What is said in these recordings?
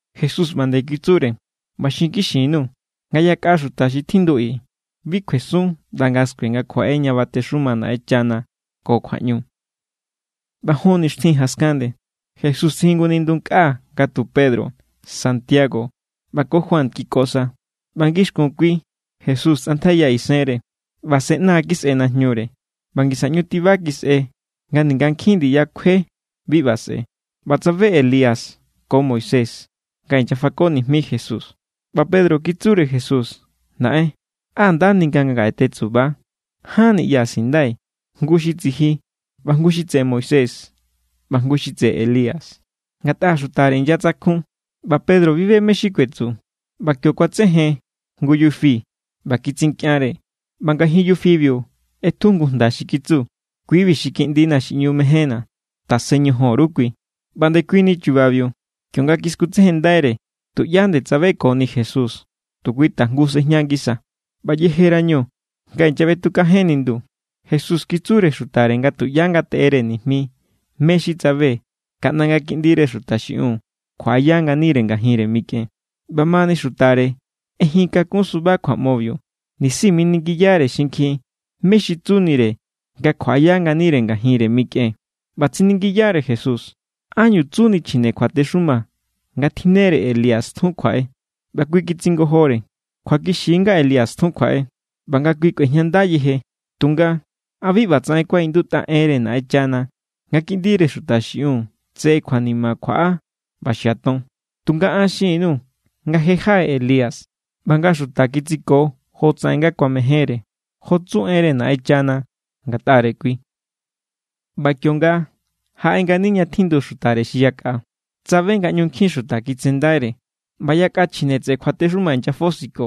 Jesús ꞌba nde kitsure: —ꞌBa xinkixi_nuu̱, nga yakꞌa xuta xi tjindu i bi kjuesun ꞌnda nga̱ skue nga kjuaꞌe ña batexuma Naꞌenchana ko kjuaꞌñu. ꞌBa jon nixtjin jaskan nde, Jesús tsijun jngu nindu nkꞌa nga tu Pedro, Santiago ꞌba ko Juan kiko sa. ꞌBa ngixkun kui, Jesús tsꞌantjaiya isenre. ꞌBa se ꞌna kisꞌe najñure ꞌba ngisa ꞌñu tiba kisꞌe nga ninga nkjin ndiya kjue bi ꞌba sꞌe̱. ꞌBa tsabe Elías ko Moisés, nga inyafako nijmi Jesús. ꞌBa Pedro kitsure Jesús: —Naꞌen, ¡á nda ni nga ngaꞌe tetsuba! Ján niꞌya sindai̱: jngu xi tsiji, ꞌba jngu xi tseꞌe Moisés ꞌba jngu xi tseꞌe Elías. Ngatꞌa xutare inyatsakjun, ꞌba Pedro bi be mé= xi kuetsu. ꞌBa kio kuatsejen jngu yufi ꞌba kitsinkꞌianre, ꞌba ngajin yufibiu ꞌetju jngu jnda xi kitsu: —Kui=bi xi kiꞌndina̱ xi ꞌñu mejénna̱; tasen ñojon_ru kui. ꞌBa ndekuini chubabiu, kionga kiskutsejenndaire, tuꞌyá nde tsabekoni Jesús, tu kui tajngu sejña ngisa. ꞌBa yejerañu nga inyaꞌbetukajen nindu, Jesús kitsure xutare nga tuꞌyá ngateꞌere nijmi mé= xi tsabe kaꞌnda nga̱ Kiꞌndire Xuta xiꞌiun kjuaꞌaya nganire ngajinre mikꞌen. ꞌBamani xutare ꞌejin kakun suba kjuaꞌmobiu, nisi miningiyare xinkjin mé= xi tsunire nga kjuaꞌaya nganire ngajinre mikꞌen. ꞌBa tsiningiyare Jesús: —¿Ánñu tsuni chjine kjuatexuma nga tjinnere Elías tjun kjuaꞌe? ꞌBa kui kitsingojore: —Kjuakixi= nga Elías tjun kjuaꞌe, ꞌba nga kui kꞌuejñanda yeje. Tunga ¿a bi ꞌbatsaꞌen kuaꞌindutꞌa enre Naꞌenchana nga Kiꞌndire Xuta xiꞌiun tse kjuanima kjuaꞌa ꞌba xiaton? Tunga an xin_nuu̱ nga je jaꞌe Elías, ꞌba nga xuta kitsiko jotsaꞌen nga kuamejénre, jo tsu enre Naꞌenchana ngatꞌare kui. ꞌBa kionga jaꞌe ngani ña tjindu xutare xi yakꞌa, tsabe nga ꞌñu nkjin xuta kitsendaire; ꞌba yakꞌa chjine tseꞌe kjuatexuma inyafosiko.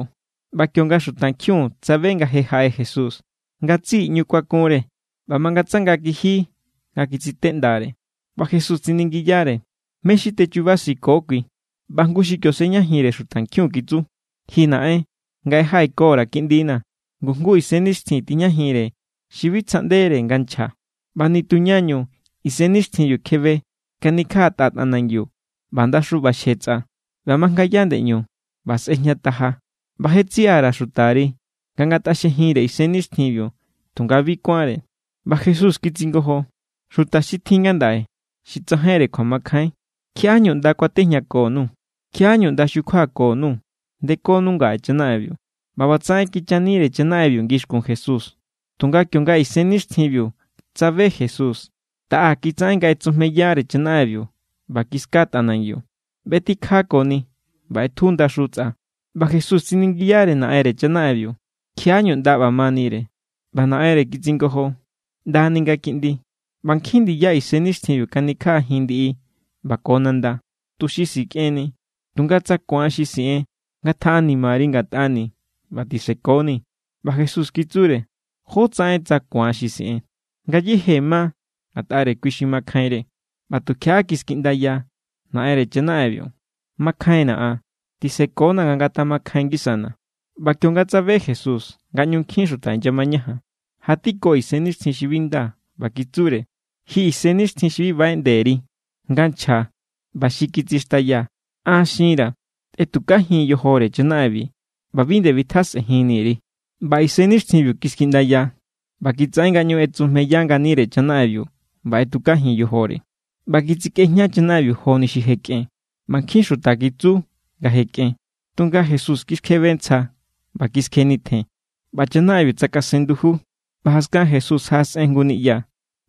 ꞌBa kionga xutankjiun tsabe nga je jaꞌe Jesús, ngatsiꞌi ꞌñu kuakunre ꞌba mangatsanga kiji nga kitsiteꞌndare. ꞌBa Jesús tsiningiyare: —¿Mé= xi techubasiko kui? ꞌBa jngu xi kio sejñajinre xutankjiun kitsu: —Ji naꞌen, ngaꞌe jaꞌekora̱ kiꞌndina̱, ngu jngu isennixtjin tijñajinre xi bi tsjaꞌndere nga nchja. ꞌBa nitu ñañu isennixtjinbiu kjebe, kanikjaꞌatꞌa tꞌanangiu, ꞌba ndaxu ꞌbaxje tsꞌa, ꞌba majngaya ndeꞌñu ꞌba sꞌejñataja. ꞌBa je tsiꞌa_ra̱ xutari nga ngatꞌaxjejinre isennixtjinbiu, tunga bi kuánre. ꞌBa Jesús kitsingojo: —¡Xuta xi tjin ngandaꞌe xi tsajainre kjuamakjain! ¿Kjiaꞌá=ñu ꞌnda kuatejñako_nuu̱? ¿Kjiaꞌá=ñu ꞌnda xukjuako_nuu̱? Ndekonu ngaꞌe chanaꞌenbiu. ꞌBa ꞌbatsaꞌen kichanire chanaꞌenbiu ngixkun Jesús. Tunga kionga isennixtjinbiu tsabe Jesús, taꞌa kitsaꞌen nga ꞌetsujmeyare chanaꞌenbiu ꞌba kiska tꞌanangiu, ꞌbetikjakoni ꞌba ꞌetju ndaxu tsꞌa. ꞌBa Jesús tsiningiyare naꞌenre chanaꞌenbiu: —¿Kjiaꞌá=ñu ꞌnda ꞌba manire? ꞌBa naꞌenre kitsingojo: —ꞌNdani nga kiꞌndi; ꞌba nkjin ndiya isennixtjinbiu kanikjaꞌajin ndiꞌi ꞌba ko nanda, tuxi sikꞌenni. Tunga tsa ku̱an xi siꞌen, ngatjaꞌanimari ngatꞌani̱ ꞌba tisekoni. ꞌBa Jesús kitsure: —¿Jótsaꞌen tsa “ku̱an xi siꞌen”? Ngayéje ma ngatꞌare kui xi makjainre. ꞌBa tukjiaꞌa kiskiꞌndaya naꞌenre chanaꞌenbiu: —¡Makjainna̱ an; tisekona nga ngatamakjain ngisana̱! ꞌBa kionga tsabe Jesús nga ꞌñu nkjin xuta inyamañajan, jatiko isennixtjin xi bi nda, ꞌba kitsure: —Ji isennixtjin xi bi baꞌeꞌnde_ri nga nchja ꞌba xi kitsixtaya, an xinra̱ tꞌetukajin yojore chanaꞌenbi, ꞌba bi nde bitjasꞌenjinni_ri. ꞌBa isennixtjinbiu kiskiꞌndaya, ꞌba kitsaꞌen nga ꞌñu ꞌetsujmeya nganire chanaꞌenbiu ꞌba ꞌetukajin yojore. ꞌBa kitsikꞌejña chanaꞌenbiu joni xi je kꞌen, ꞌba nkjin xuta kitsu nga je kꞌen. Tunga Jesús kiskjebe ntsja, ꞌba kiskjenitjen; ꞌba chanaꞌenbiu tsakasen nduju. ꞌBa jaskan Jesús jaꞌasꞌen jngu niꞌya,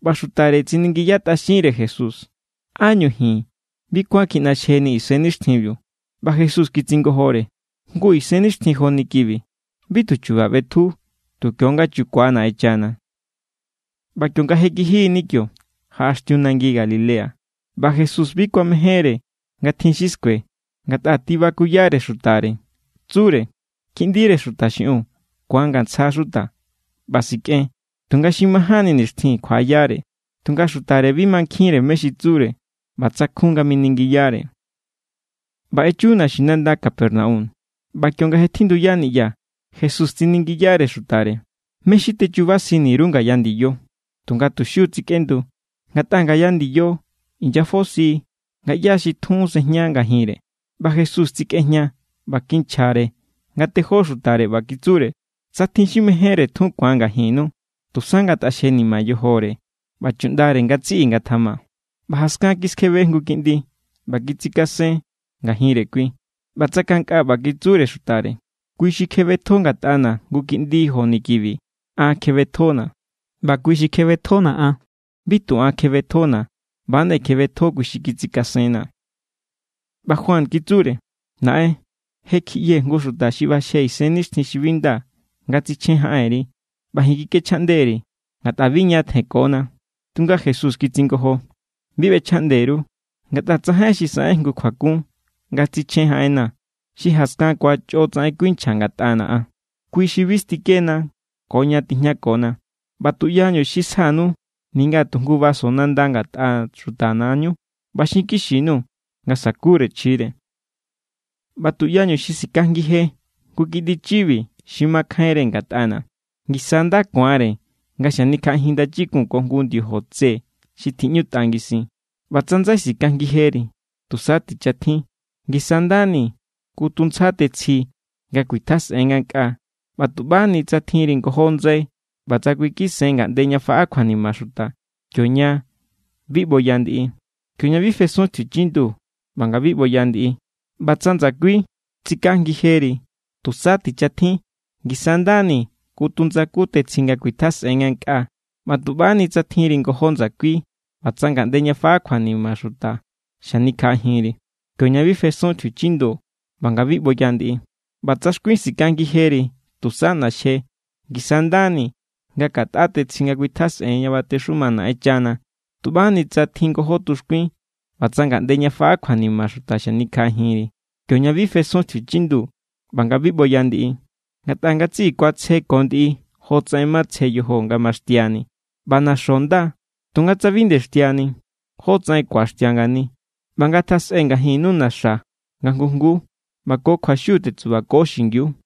ꞌba xutare tsiningiyatꞌaxinre Jesús: —¿Ánñu ji̱n bi kuán kjiꞌnaxjenii̱ isennixtjinbiu? ꞌBa Jesús kitsingojore: —Jngu isennixtjin joni kibi bi tu chu̱ba̱ ꞌbetju, tu kio=nga chukua Naꞌenchana. ꞌBa kionga je kijini kio, jaꞌaxtiu nangi Galilea. ꞌBa Jesús bi kuamejénre nga tjin xi skue, ngatꞌa tibakuyare xutare. Tsure: —Kiꞌndire Xuta xiꞌiun ku̱angantsja xuta, ꞌba sikꞌen; tunga xi majánni nixtjin, kjuaꞌayare. Tunga xutare bi mankjinre mé= xi tsure, ꞌba tsakjun nga miningiyare. ꞌBa echu naxinanda Capernaum. ꞌBa kionga je tjinduya niꞌya, Jesús tsiningiyare xutare: —¿Mé= xi techubasini_ru ngaya ndiyo? Tunga tu xiu= tsikꞌendu, ngatꞌa ngaya ndiyo inyafosi nga ꞌyá= xi tjun sejña ngajinre. ꞌBa Jesús tsikꞌejña ꞌba kinchjare nga tejó xutare, ꞌba kitsure: —Tsa tjin xi mejénre tjun ku̱an ngajinnu, tusa ngataxjenima yojore, ꞌba chuꞌndare ngatsiꞌi ngatjama. ꞌBa jaskan kiskjebe jngu kiꞌndi ꞌba kitsikasen ngajinre kui, ꞌba tsakankꞌa ꞌba kitsure xutare: —Kui xi kjebetjo ngatꞌana̱ jngu kiꞌndi joni kibi, an kjebetjona̱; ꞌba kui xi kjebetjona̱ an, bi tu an kjebetjona̱, ꞌba=nde kjebetjo kui xi kitsikasenna̱. ꞌBa Juan kitsure: —Naꞌen, je kjiꞌyee̱ jngu xuta xi ꞌbaxje isennixtjin xi bi nda nga tsichjen jaꞌenri ꞌba ji̱n kikꞌechjaꞌnde_ri̱, ngatꞌa bi ña tjenkona. Tunga Jesús kitsingojo: —Bi ꞌbechjaꞌnde_ru; ngatꞌa tsajain xi saꞌen jngu kjuakun nga tsichjen jaꞌenna̱, xi jaskan ku̱an chꞌo tsaꞌen kuinchja ngatꞌana̱ an. Kui= xi bi stikena, ko ña tijñakona. ꞌBa tuꞌyañu xi sjanu ninga tu jngu vaso nanda ngatꞌa xutana̱= ñu, ꞌba xinkixi_nuu̱ nga sakure chjire. ’ꞌBa tuꞌyañu xi sikajngije jngu kiꞌndi chibi xi makjainre ngatꞌana̱, ngisa= nda ku̱anre nga xanikjaꞌajin ndachikun ko jngu ndiojo tse xi tjiꞌñutꞌa ngisin. ꞌBa tsa ndsai sikajngijeri, tusa tichatjin; ngisa= nda ni kutu ntsja tetsji nga kuitjasꞌen ngankꞌaa, ꞌba tuꞌbani tsa tjinri ngojó ndsai ꞌba tsa kꞌuikisen ngaꞌnde ña faꞌa kjuanima xuta, kioña bi ꞌboya ndiꞌi. Kioña bi fesun tjiuchindu ꞌba nga bi ꞌboya ndiꞌi. ꞌBa tsa ndsakui sikajngijeri, tusa tichatjin; ngisa= ndani kutu ndsaku tetsji nga kuitjasꞌen ngankꞌaa, ꞌba tuꞌbani tsa tjinri ngojó ndsakui ꞌba tsa ngaꞌnde ña faꞌa kjuanima xuta xanikjaꞌajinri. Kioña bi fesun tjiuchindu ꞌba nga bi ꞌboya ndiꞌi. ꞌBa tsa xkuin sikajngijeri, tusa ꞌnaxje; ngisa= nda ni nga katꞌa tetsji nga kuitjasꞌen ña batexuma Naꞌenchana tuꞌbani tsa tjin ngojó tuxkuin ꞌba tsa ngaꞌnde ña faꞌa kjuanima xuta xanikjaꞌajinri, kioña bi fesun tjiuchindu ꞌba nga bi ꞌboya ndiꞌi. ’Ngatꞌa ngatsiꞌi ku̱atsje ko ndiꞌi jotsaꞌen matsje yojo nga maxtiani. ꞌBa na̱xo̱ nda; tunga tsa bi nde xtiani, ¿jótsaꞌen ku̱axtia ngani? ꞌBa ngatjasꞌe ngajinnu na̱xa̱ nga jngu jnguu, ꞌba ko kjuaxiu tetsubako xingiu.